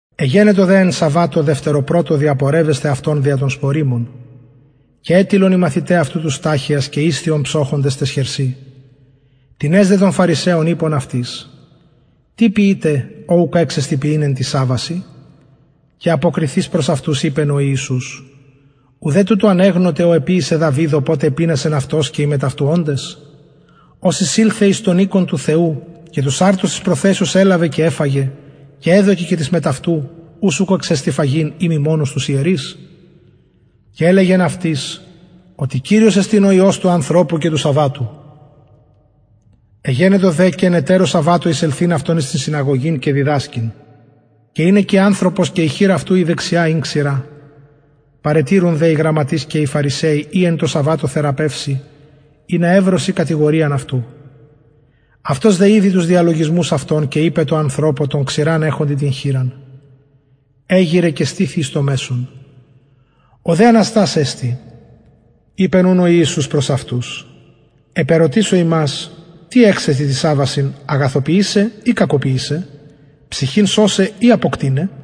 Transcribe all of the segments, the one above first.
εγενετο δε εν σαββατω δευτεροπρωτω διαπορευεσθαι αυτον δια των σποριμων και ετιλλον οι μαθηται αυτου τους σταχυας και ησθιον ψωχοντες ταις χερσιν τινες δε των φαρισαιων ειπον αυτοις τι ποιειτε ο ουκ εξεστιν ποιειν εν τοις σαββασιν και αποκριθεις προς αυτους ειπεν ο ιησους ουδε τουτο ανεγνωτε ο εποιησεν δαυιδ οποτε επεινασεν αυτος και οι μετ αυτου οντες ως εισηλθεν εις τον οικον του θεου και τους αρτους της προθεσεως ελαβεν και εφαγεν και εδωκεν και τοις μετ αυτου ους ουκ εξεστιν φαγειν ει μη μονους τους ιερεις και ελεγεν αυτοις οτι κυριος εστιν ο υιος του ανθρωπου και του σαββατου εγενετο δε και εν ετερω σαββατω εισελθειν αυτον εις την συναγωγην και διδασκειν και ην εκει ανθρωπος και η χειρ αυτου η δεξια ην ξηρα παρετηρουν δε οι γραμματεις και οι φαρισαιοι ει εν τω σαββατω θεραπευσει ινα ευρωσιν κατηγοριαν αυτου αυτος δε ηδει τους διαλογισμους αυτων και ειπεν τω ανθρωπω τω ξηραν εχοντι την χειρα εγειραι και στηθι εις το μεσον ο δε αναστας εστη ειπεν ουν ο ιησους προς αυτους επερωτησω υμας τι εξεστιν τοις σαββασιν αγαθοποιησαι η κακοποιησαι ψυχην σωσαι η αποκτειναι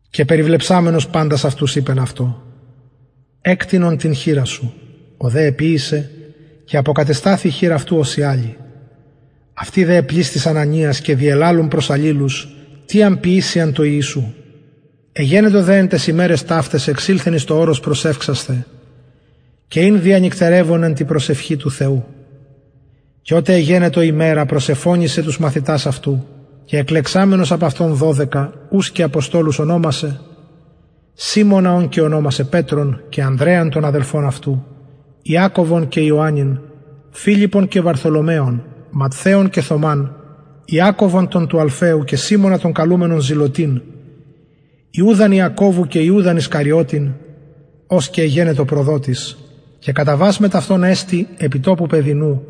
και περιβλεψαμενος παντας αυτους ειπεν αυτω εκτεινον την χειρα σου ο δε εποιησεν και αποκατεσταθη η χειρ αυτου υγιης ως η αλλη αυτοι δε επλησθησαν ανοιας και διελαλουν προς αλληλους τι αν ποιησειαν τω ιησου εγενετο δε εν ταις ημεραις ταυταις εξηλθεν εις το ορος προσευξασθαι και ην διανυκτερευων εν τη προσευχη του θεου και οτε εγενετο ημερα προσεφωνησεν τους μαθητας αυτου και εκλεξαμενος απ αυτων δωδεκα ους και αποστολους ωνομασεν σιμωνα ον και ωνομασεν πετρον και ανδρεαν τον αδελφον αυτου ιακωβον και ιωαννην φιλιππον και βαρθολομαιον ματθαιον και θωμαν ιακωβον τον του αλφαιου και σιμωνα τον καλουμενον ζηλωτην ιουδαν ιακωβου και ιουδαν ισκαριωτην ος και εγενετο προδοτης και καταβας μετ αυτων εστη επι τοπου πεδινου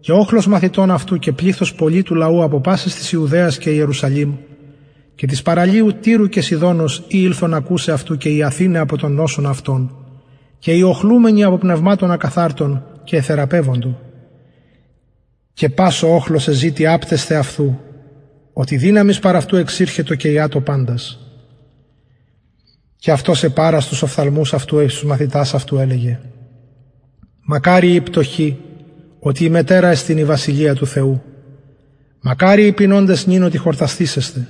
και οχλος μαθητων αυτου και πληθος πολυ του λαου απο πασης της ιουδαιας και ιερουσαλημ και της παραλιου τυρου και σιδωνος οι ηλθον ακουσαι αυτου και ιαθηναι απο των νοσων αυτων και οι οχλουμενοι υπο πνευματων ακαθαρτων και εθεραπευοντο και πας ο οχλος εζητει απτεσθαι αυτου οτι δυναμις παρ αυτου εξηρχετο και ιατο παντας και αυτος επαρας τους οφθαλμους αυτου εις τους μαθητας αυτου ελεγεν μακαριοι οι πτωχοι οτι υμετερα εστιν η βασιλεια του θεου μακαριοι οι πεινωντες νυν οτι χορτασθησεσθε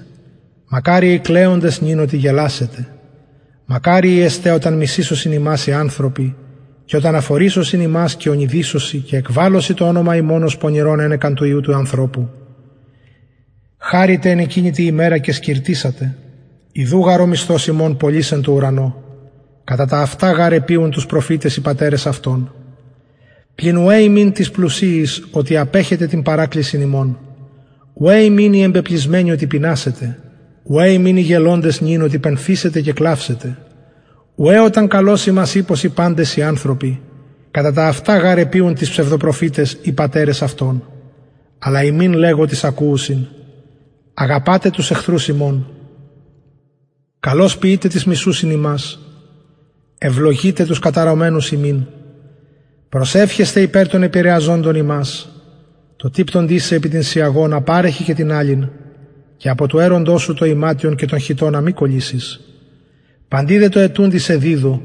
μακαριοι οι κλαιοντες νυν οτι γελασετε μακαριοι εστε οταν μισησωσιν υμας οι ανθρωποι και οταν αφορισωσιν υμας και ονειδισωσιν και εκβαλωσιν το ονομα υμων ως πονηρον ενεκα του υιου του ανθρωπου χαρητε εν εκεινη τη ημερα και σκιρτησατε ιδου γαρ ο μισθος υμων πολυς εν τω ουρανω κατα ταυτα γαρ εποιουν τοις προφηταις οι πατερες αυτων πλην ουαι υμιν τοις πλουσιοις οτι απεχετε την παρακλησιν υμων ουαι υμιν οι εμπεπλησμενοι οτι πεινασετε ουαι υμιν οι γελωντες νυν οτι πενθησετε και κλαυσετε ουαι οταν καλως υμας ειπωσιν οι ανθρωποι κατα ταυτα γαρ εποιουν τοις ψευδοπροφηταις οι πατερες αυτων αλλ υμιν λεγω τοις ακουουσιν αγαπατε τους εχθρους υμων καλως ποιειτε τοις μισουσιν υμας ευλογειτε τους καταρωμενους υμιν προσευχεσθε υπερ των επηρεαζοντων υμας τω τυπτοντι σε επι την σιαγονα παρεχε και την αλλην και απο του αιροντος σου το ιματιον και τον χιτωνα μη κωλυσης παντι δε τω αιτουντι σε διδου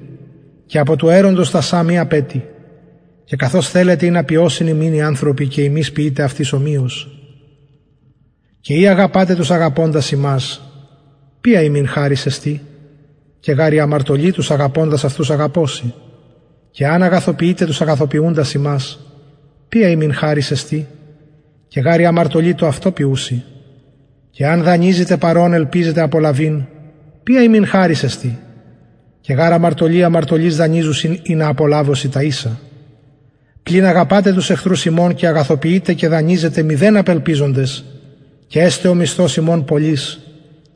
και απο του αιροντος τα σα μη απαιτει και καθως θελετε ινα ποιωσιν υμιν οι ανθρωποι και υμεις ποιειτε αυτοις ομοιως και ει αγαπατε τους αγαπωντας υμας ποια υμιν χαρις εστιν και γαρ οι αμαρτωλοι τους αγαπωντας αυτους αγαπωσιν και εαν αγαθοποιητε τους αγαθοποιουντας υμας ποια υμιν χαρις εστιν και γαρ οι αμαρτωλοι το αυτο ποιουσιν και εαν δανειζητε παρ ων ελπιζετε απολαβειν ποια υμιν χαρις εστιν και γαρ αμαρτωλοι αμαρτωλοις δανειζουσιν ινα απολαβωσιν τα ισα πλην αγαπατε τους εχθρους υμων και αγαθοποιειτε και δανειζετε μηδεν απελπιζοντες και εσται ο μισθος υμων πολυς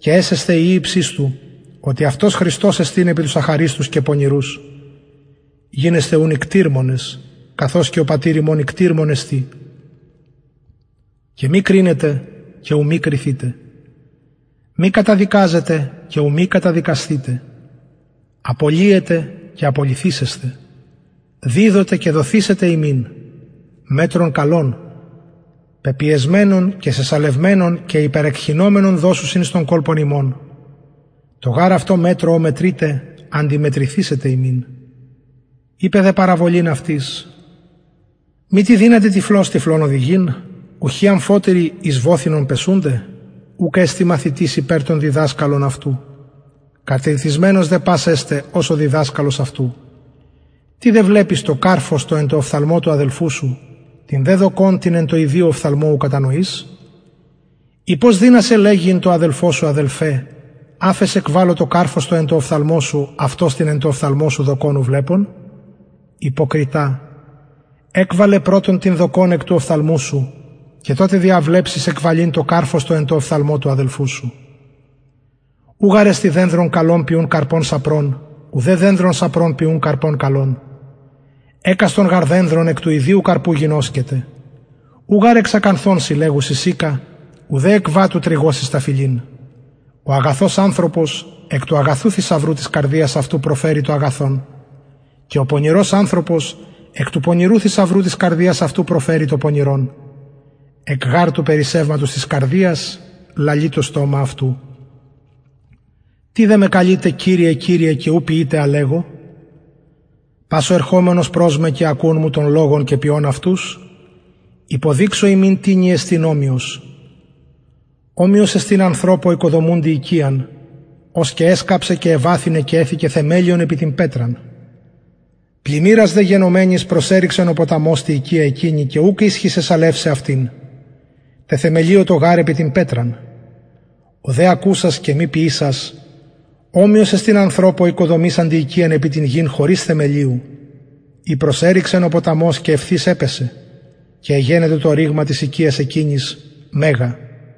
και εσεσθε υιοι υψιστου οτι αυτος χρηστος εστιν επι τους αχαριστους και πονηρους γινεσθε ουν οικτιρμονες καθως και ο πατηρ υμων οικτιρμων εστιν και μη κρινετε και ου μη κριθητε μη καταδικαζετε και ου μη καταδικασθητε απολυετε και απολυθησεσθε διδοτε και δοθησεται υμιν μετρον καλον πεπιεσμενον και σεσαλευμενον και υπερεκχυνομενον δωσουσιν εις τον κολπον υμων τω γαρ αυτω μετρω ω μετρειτε αντιμετρηθησεται υμιν ειπεν δε παραβολην αυτοις μητι δυναται τυφλος τυφλον οδηγειν ουχι αμφοτεροι εις βοθυνον πεσουνται ουκ εστιν μαθητης υπερ τον διδασκαλον αυτου κατηρτισμενος δε πας εσται ως ο διδασκαλος αυτου τι δε βλεπεις το καρφος το εν τω οφθαλμω του αδελφου σου την δε δοκον την εν τω ιδιω οφθαλμω ου κατανοεις η πως δυνασαι λεγειν τω αδελφω σου αδελφε αφες εκβαλω το καρφος το εν τω οφθαλμω σου αυτος την εν τω οφθαλμω σου δοκον ου βλεπων υποκριτα εκβαλε πρωτον την δοκον εκ του οφθαλμου σου και τοτε διαβλεψεις εκβαλειν το καρφος το εν τω οφθαλμω του αδελφου σου ου γαρ εστιν δενδρον καλον ποιουν καρπον σαπρον ουδε δενδρον σαπρον ποιουν καρπον καλον εκαστον γαρ δενδρον εκ του ιδιου καρπου γινωσκεται ου γαρ εξ ακανθων συλλεγουσιν συκα ουδε εκ βατου τρυγωσιν σταφυλην ο αγαθος ανθρωπος εκ του αγαθου θησαυρου της καρδιας αυτου προφερει το αγαθον και ο πονηρος ανθρωπος εκ του πονηρου θησαυρου της καρδιας αυτου προφερει το πονηρον εκ γαρ του περισσευματος της καρδιας λαλει το στομα αυτου τι δε με καλειτε κυριε κυριε και ου ποιειτε α λεγω πας ο ερχομενος προς με και ακουων μου των λογων και ποιων αυτους υποδειξω υμιν τινι εστιν ομοιος ομοιος εστιν ανθρωπω οικοδομουντι οικιαν ος εσκαψεν και εβαθυνεν και εθηκεν θεμελιον επι την πετραν πλημμυρας δε γενομενης προσερρηξεν ο ποταμος τη οικια εκεινη και ουκ ισχυσεν σαλευσαι αυτην τεθεμελιωτο γαρ επι την πετραν ο δε ακουσας και μη ποιησας ομοιος εστιν ανθρωπω οικοδομησαντι οικιαν επι την γην χωρις θεμελιου η προσερρηξεν ο ποταμος και ευθεως επεσεν και εγενετο το ρηγμα της οικιας εκεινης μεγα